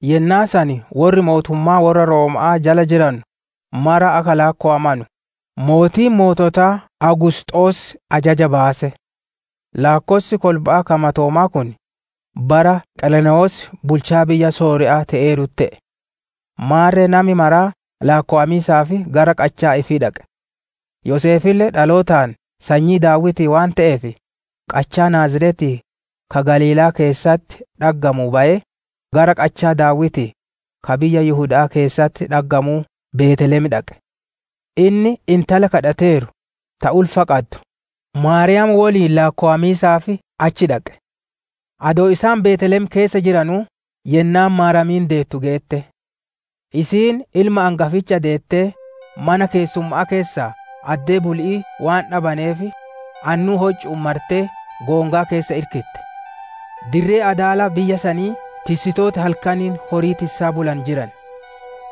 Yennaa san worri mootummaa worra Rooma'aa jala jiranu mara akka laakkowamanu, mootiin moototaa Awugusxoos ajaja baase. Laakkossi kolba'aa ka matoomaa kun, bara Qereenewos bulchaa biyya Sooriya'aa te'eerutti te'e. Maarre nami maraa laakkowamiisaaf gara qachaa ifii dhaqe. Yoseefille dhalootaan sanyii Daawitii waan te'eef, qachaa Naaziretii ka Galiilaa keessatti dhaggamuu bayee, gara qachaa Daawitii, ka biyya Yihuda'aa keessatti dhaggamuu Beeteelem dhaqe. Inni intala kadhateeru, ta ulfa qaddu, Maariyaam woliin laakkowamiisaaf achi dhaqe. Adoo isaan Beeteelem keessa jiranuu, yennaan Maariyaamiin deettu geette. Isiin ilma angaficha deettee, mana keessumma'aa keessaa addee buli'ii waan dhabaneef, annuu hoccu'uun martee goongaa keessa irkitte. Dirree adaala biyya saniititti tissitooti halkaniin horii tissaa bulanu jiran.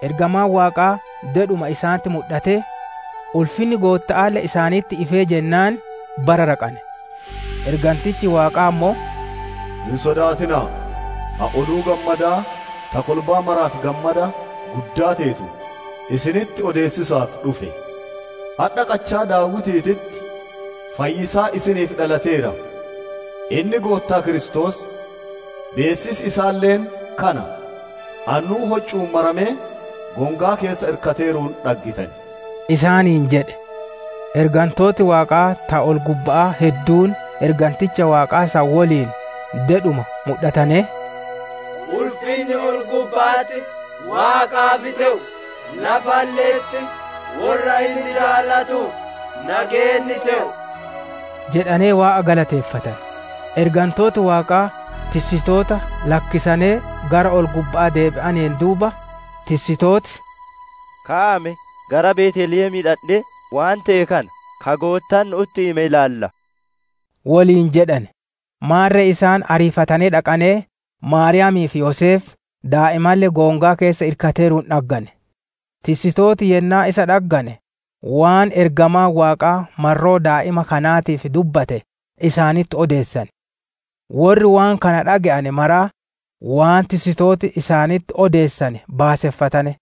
Ergamaan waaqaa dedhuma isaanitti mudhatee, ulfinni Gootta'aalle isaanitti ifee jennaan bararaqane. Ergantichi Waaqaa ammoo, «Hin sodaatina'a! Ani oduu gammadaa ta kolbaa maraaf gammada guddaa teetu isinitti odeessiisaaf dhufe. Adha qachaa Daawitiititti fayyisaan isiniif dhalateera; inni Goottaa Kiristoos. Beessisi isaalle kana: annuu hoccu'uun maramee, goongaa keessa irkateeruun dhaggitan» isaaniin jedhe. Ergantooti Waaqaa ta ol-gubba'aa hedduun erganticha Waaqaa san woliin dedhuma mudhatanee, «Ulfinni ol-gubba'atti Waaqaaf te'u, lafalle'etti worra inni jaalatuuf nageenni te'u» jedhanee Waaqaa galateeffatane. Ergantooti Waaqaa tissitoota lakkisanee gara ol-gubba'aa deebi'aneen duuba, tissitooti, «Ka'aa me, gara Beeteelemii dhandhee, waan te'e kana, ka Goottaan nu'utti hime ilaallaa!» woliin jedhane. Maarre isaan ariifatanee dhaqanee, Maariyaami'ii fi Yoseef, daa'imalle goongaa keessa irkateeruun dhaggane. Tissitooti yennaa isa dhaggane, waan ergamaan Waaqaa marroo daa'ima kanaatiif dubbate isaanitti odeessane. Worri waan kana dhage'ane maraa, waan tissitooti isaanitti odeessane baaseffatane.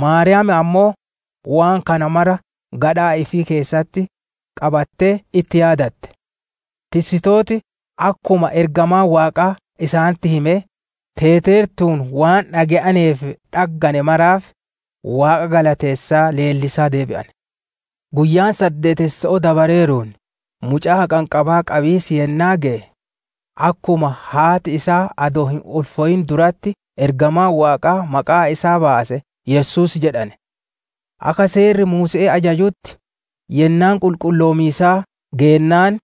Maariyaamiin ammoo, waan kana mara gadhaa ifii keessatti qabattee itti yaadatte. Tissitooti akkuma ergamaan Waaqaa isaanitti hime teeteertuun waan dhage'anee fi dhagganne maraaf, Waaqa galateessaa leellisaa deebi'ane. Guyyaan saddeetesso'oo dabareeruun, mucaa haqanqabaa qabiis yennaa geye, akkuma haati isaa adoo hin ulfooyin duratti ergamaan Waaqaa maqaa isaa baase «Yesuus» jedhane. Akka Seerri Muuse'ee ajajutti, yennaan qulqulloomiisaa geennaan,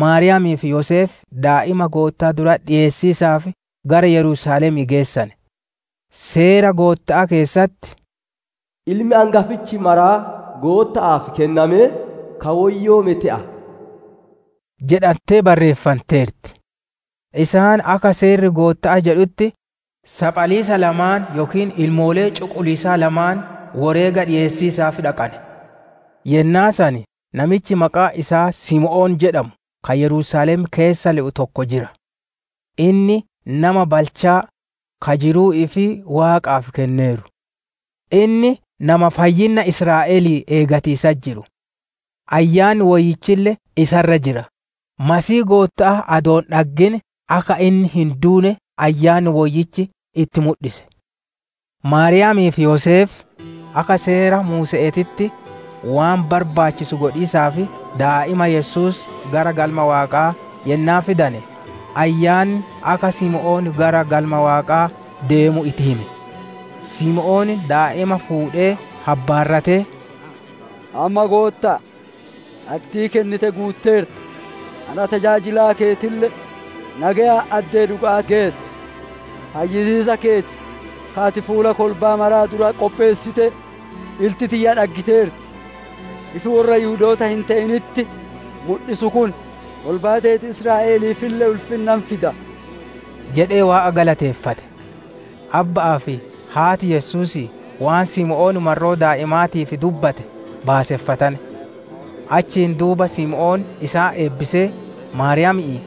Maariyaami'ii fi Yoseef daa'ima Goottaa duratti dhiyeessiisaaf gara Yerusaalemii geessane. Seera Gootta'aa keessatti, «Ilmi angafichi maraa Gootta'aaf kennamee ka woyyoome te'a» jedhantee barreeffanteerti. Isaan akka seerri Gootta'aa jedhutti, saphaliisa lamaan yookiin maddoo lamaan woreega dhiyeessiisaaf dhaqane. Yennaa san namichi maqaan isaa Simoon jedhamu ka Yerusaalem keessa le'u tokko jira. Inni nama balchaa, ka jiruu ifii Waaqaaf kenneeru. Inni nama fayyinna Israa'elii eeggatiisatti jiru; Ayyaanni Woyyichille isa irra jira. Masiihii Gootta'aa adoo hin dhaggin akka inni hin duune Ayyaanni Woyyichi itti mudhise. Maariyaamii fi Yoseef akka Seera Muuse'eetitti waan barbaachisu godhiisaaf daa'ima Yesuus gara Galma Waaqaa yennaa fidane, Ayyaanni akka Simoon gara Galma Waaqaa deemu itti hime. Simoon daa'ima fuudhee habbaarratee, «Amma, Goottaa, addii kennite guutteerta, ana tajaajilaa keetille nageyaan addee dhuga'aa geessi. Fayyisiisa keeti ka ati fuula kolbaa maraa duratti qopheessite, ilti tiyya dhaggiteerti. Ifi worra Yihudoota hin te'initti mudhisu kun, kolbaa teeti Israa'eliifille ulfinna hin fida» jedhee Waaqa galateeffate. Abbaa fi haati Yesuusii waan Simoon marroo daa'imaatii dubbate baaseffatane. Achiin duuba Simoon isaan eebbisee, Maariyaami'iin,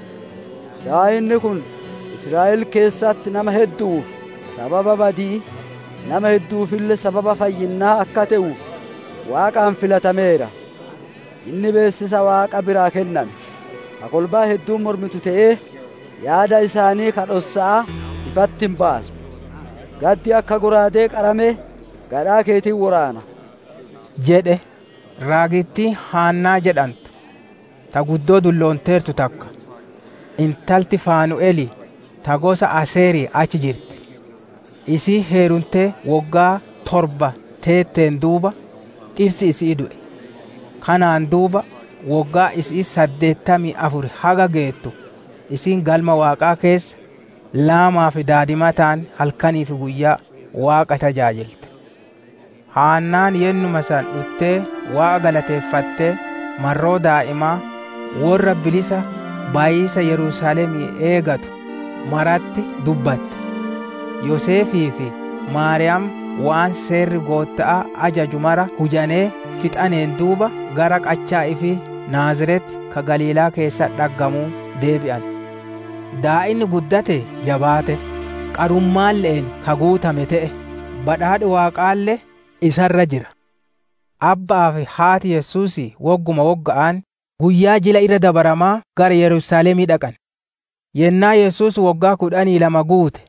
«Daa'inni kun Israa'el keessatti nama heddu'uuf sababa badi'ii, nama heddu'uufille sababa fayyinnaa akka te'uuf Waaqaan filatameera. Inni beessisa Waaqa biraa kenname, ka kolbaan hedduun mormitu te'ee, yaada isaanii ka dhossa'aa ifatti hin baasa. Gaddi akka shallaagaa qaramee gadhaa keeti hin woraana» jedhe. Raagittiin Haannaa jedhantu, ta guddoo dulloonteertu takka, intalti Faanu'elii, ta gosa Aseerii achi jirti. Isiin heerumtee woggaa torba teetteen duuba, dhirsi isi'ii du'e. Kanaan duuba woggaan isi'ii saddeettamii afuri haga geettu, isiin Galma Waaqaa keessa laamaa fi daadimataan halkanii fi guyyaa Waaqa tajaajilte. Haannaan yennuma san dhuttee Waaqa galateeffattee, marroo daa'imaa worra bilisa bayiisa Yerusaalemii eegatu maratti dubbatte. Yoseefii fi Maariyaam waan Seerri Gootta'aa ajaju mara hujanee fixaneen duuba, gara qachaa ifii Naaziret, ka Galiilaa keessatti dhaggamuu deebi'ane. Daa'inni guddatee jabaate; qarummaalle'een ka guutame te'e; badhaadhi Waaqaalle isa irra jira. Abba'aa fi haati Yesuusii wogguma wogga'aan guyyaa Jila Irra Dabaramaa gara Yerusaalemii dhaqan. Yennaa Yesuus woggaa kudhanii lama guute,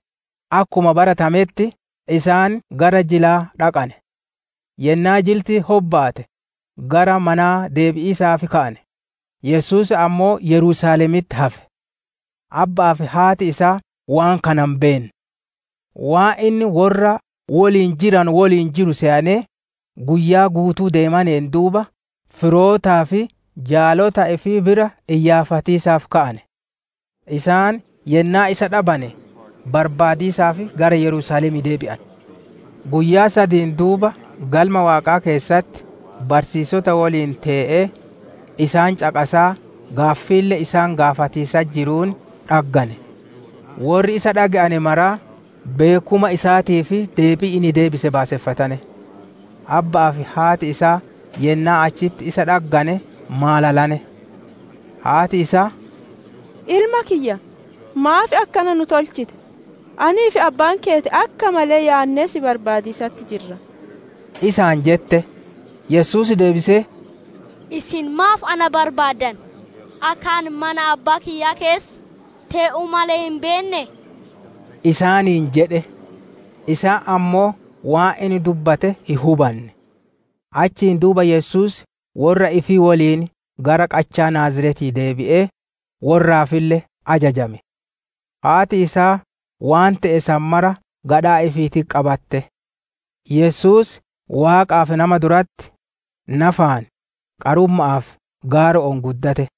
akkuma baratametti isaan gara jilaa dhaqane. Yennaa jilti hobbaate, gara manaa deebi'iisaaf ka'ane; Yesuus ammoo Yerusaalemitti hafe. Abba'aa fi haati isaa waan kana hin beenne. Waan inni worra woliin jiranu woliin jiru seyanee, guyyaa guutuu ideemaneen duuba firootaa fi jaalota ifii bira iyyaafatiisaaf ka'ane. Isaan yennaa isa dhabane, barbaadiisaaf gara Yerusaalemii deebi'ane. Guyyaa sadiin duuba Galma Waaqaa keessatti barsiisota woliin tee'ee, isaan caqasaa gaaffiille isaan gaafatiisatti jiruun dhaggane. Worri isa dhage'ane maraa beekkuma isaatii fi deebii inni deebise baaseffatane. Abba'aa fi haati isaa yennaa achitti isa dhaggane maalalane. Haati isaa, «Ilma kiyya maaf akkana nu tolchite? Anii fi abbaan keeti akka malee yaannee si barbaadiisatti jirra» isaan jette. Yesuus deebisee, «Isin maaf na barbaaddan? Akka ani mana Abbaa kiyyaa keessa tee'uu male hin beennee?» isaaniin jedhe. Isaan ammoo waan inni dubbate hin hubanne. Achiin duuba Yesuus worra ifii woliin gara qachaa Naaziretii deebi'ee, worraafille ajajame. Haati isaa waan te'e san mara gadhaa ifiititti qabatte. Yesuus Waaqaa fi nama duratti, nafaan, qarumma'aa fi gaaro'oon guddate.